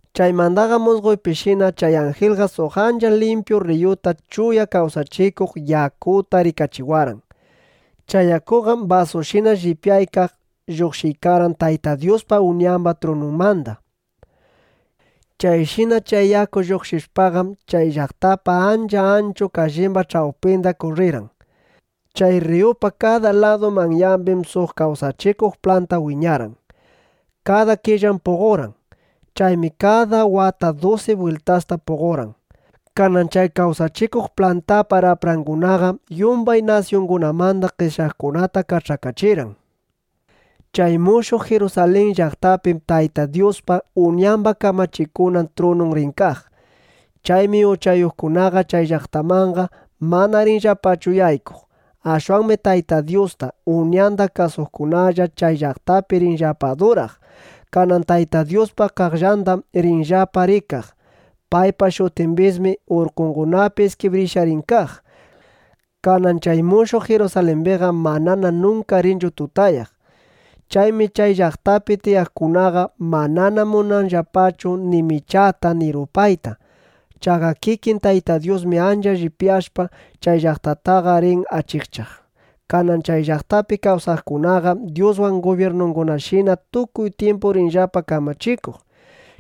Chaymandaqam musqoypishina chay anjilqa suq ancha limpyu rriyuta chuya kawsachikuq yakuta rikachiwarqan. Chay yakuqam basushina llipyaykaq, lluqshiykarqan Tayta Dyuspa, Uñamba trununmanda. Chayshina chay yaku lluqshishpaqam, chay llaqtapa ancha anchu kallimba ch'awpinda kurrirqan. Chay rriyupa kada ladu manyambim suq kawsachikuq planta wiñarqan. Kada killam puqorqan. Chaymi kada wata dusi bwiltasta puqorqan. Kanan chay kawsachikuq plantapa raprangunaqam yumbay nasyungunamanda qeshyaqkunata kach'akachirqan. Chay mushuq Jirusalin llaqtapim Tayta Dyuspa, Uñamba kamachikunan trunun rin kaq. Chaymi uchayuqkunaqa chay llaqtamanqa mana rinllapachu yaykuq. Ashwanmi Tayta Dyusta, Uñanda kasuqkunalla chay llaqtapi rinllapa aduraq. Kanan Tayta Dyuspa qaqllandam rinllapa rikaq. Paypa shutimbismi urkungunapi iskibrishqa rin kaq. Kanan chay mushuq Jirusalimbiqam manana nunka rinchu tutayaq. Chaymi chay llaqtapi tiyaqkunaqa manana munanqallapachu ni michata ni rupayta. Chaqa kikin Tayta Dyusmi ancha llipyashpa, chay llaqtataqa rin achikchaq. Kanan chay llaqtapi kawsaqkunaqam Dyuswan gubyirnukunashina tukuy tyimpu rinllapa kamachikuq.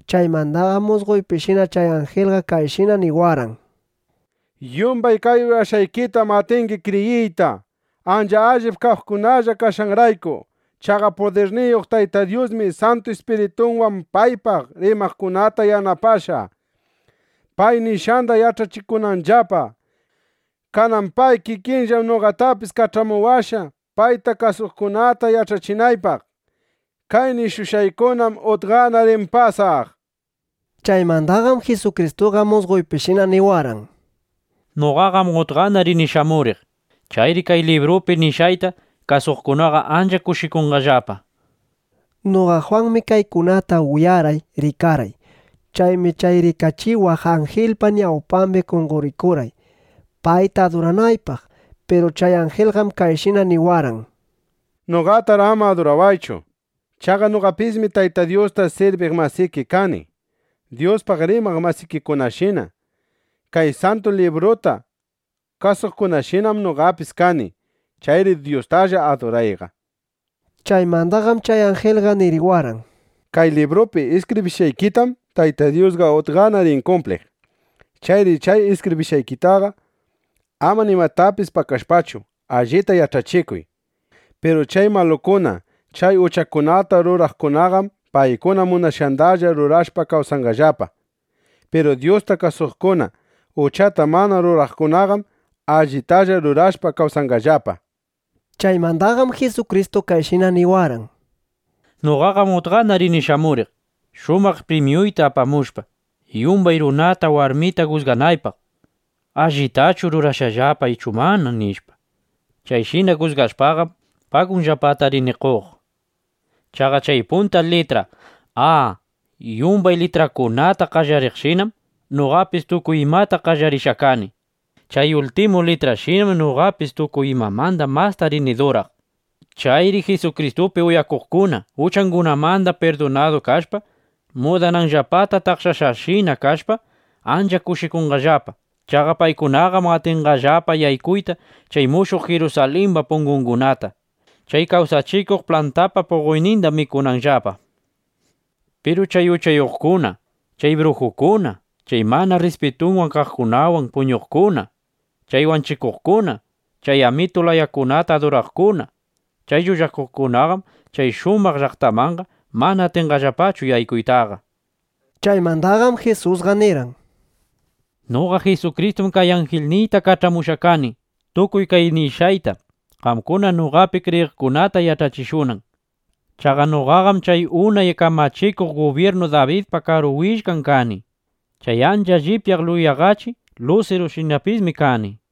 Chaymandaqam musqoypishina chay anjilqa kayshina niwarqan: —Yumbay kay uyashqaykitam atingi kriyiyta, ancha allip kaqkunalla kashqanrayku. Chaqa pudirniyuq Tayta Dyusmi Santu Ispiritunwan paypaq rimaqkunata yanapashqa, pay nishqanda yach'achikunanllapa. Kanan pay kikinllam noqatapis kach'amuwashqa, payta kasuqkunata yach'achinaypaq: “Kay nishushqaykunam utqana rin pasaq”, nishpa. Chaymandaqam Jisukristuqa musqoypishina niwarqan: —¡Noqaqam utqana rini shamuriq! ¡Chayri kay librupi nishqayta kasuqkunaqa ancha kushikunqallapa! nishpa. Noqa Jwanmi kaykunata uyarqay, rikarqay. Chaymi chay rikachiwaq anjilpa ñawpambi qonqorikurqay, payta aduranaypaq. Piru chay anjilqam kayshina niwarqan: —Noqataqar ama adurawaychu. Chaqa noqapismi Tayta Dyusta sirbiq masiki kani. Dyuspaq rimaq masikikunashina, kay Santu Libruta kasuqkunashinam noqapis kani. Chayri Dyustalla adurayqa, nishpa. Chaymandaqam chay anjilqa niriwarqan: —Kay librupi iskibrishqaykitam Tayta Dyusqa utqana rin kumpliq. Chayri chay iskibrishqaykita ama nimatapis pakashpachu, allita yach'achikuy. Piru chay malukuna, chay uchakunata ruraqkunaqam paykuna munashqandalla rurashpa kawsanqallapa. Piru Dyusta kasuqkuna, uchata mana ruraqkunaqam allitalla rurashpa, kawsanqallapa. Chaymandaqam Jisukristu kayshina niwarqan: —Noqaqam utqana rini shamuriq, shumaq primyukunata apamushpa, yumbay runata, warmita jusganaypaq: ¿Allitachu rurashqallapa ichu mana? nishpa. Chayshina jusgashpaqam, pagunllapata rini qoq. Chaqa chay punta litra “A” yumbay litrakunata qallariqshinam noqapis tukuy imata qallarishqa kani. Chay ultimu litra “Y”shinam noqapis tukuy imamanda masta rini duraq. Chayri Jisukristupi yuyakuqkuna, uchangunamanda pirdunadu kashpa, mudananllapata taqshashqashina kashpa, ancha kushikunqallapa. Chaqa paykunaqam atinqallapa yaykuyta chay mushuq Jirusalimba pungungunata, chay kawsachikuq plantapa puqoyninda mikunanllapa. Piru chay uchayuqkuna, chay brujukuna, chay mana rrispitun kaqkunawan puñuqkuna, chay wanchikuqkuna, chay amitu layakunata aduraqkuna, chay llullakuqkunaqam chay shumaq llaqtamanqa mana atinqallapachu yaykuytaqa. Chaymandaqam Jisusqa nirqan: —Noqa Jisukristum chay anjilniyta kach'amushqa kani, tukuy kay nishqayta qamkuna noqapi kriyiqkunata yach'achishunan. Chaqa noqaqam chay unay kamachikuq gubyirnu Dabidpa karu willkan kani. Chay ancha llipyaq yulaqachi (yuraqachi) lusirushinapismi kani, nishpa.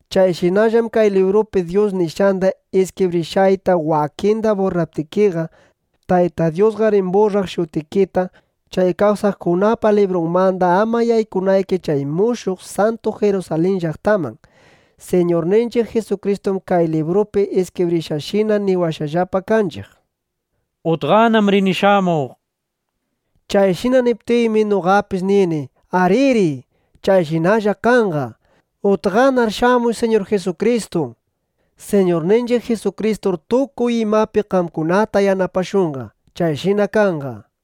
Chayshinallam kay librupi Dyus nishqanda iskibrishqayta wakinda burraptikiqa, Tayta Dyusqa rin burraq shutikita chay kawsaqkunapa librunmanda, ama yaykunayki chay mushuq santu Jirusalin llaqtaman. Siñurninchiq Jisukristum kay librupi iskibrishqayshina niwashqallapa kanchiq: —Utqanam rini shamuq, nishpa. Chayshina niptinmi, noqapis nini: ¡Ariri! ¡Chayshinalla kanqa! ¡Utqanar shamuy, Siñur Jisukristu! nishpa. Siñurninchiq Jisukristur tukuy imapi qamkunata yanapashunqa. Chayshina kanqa.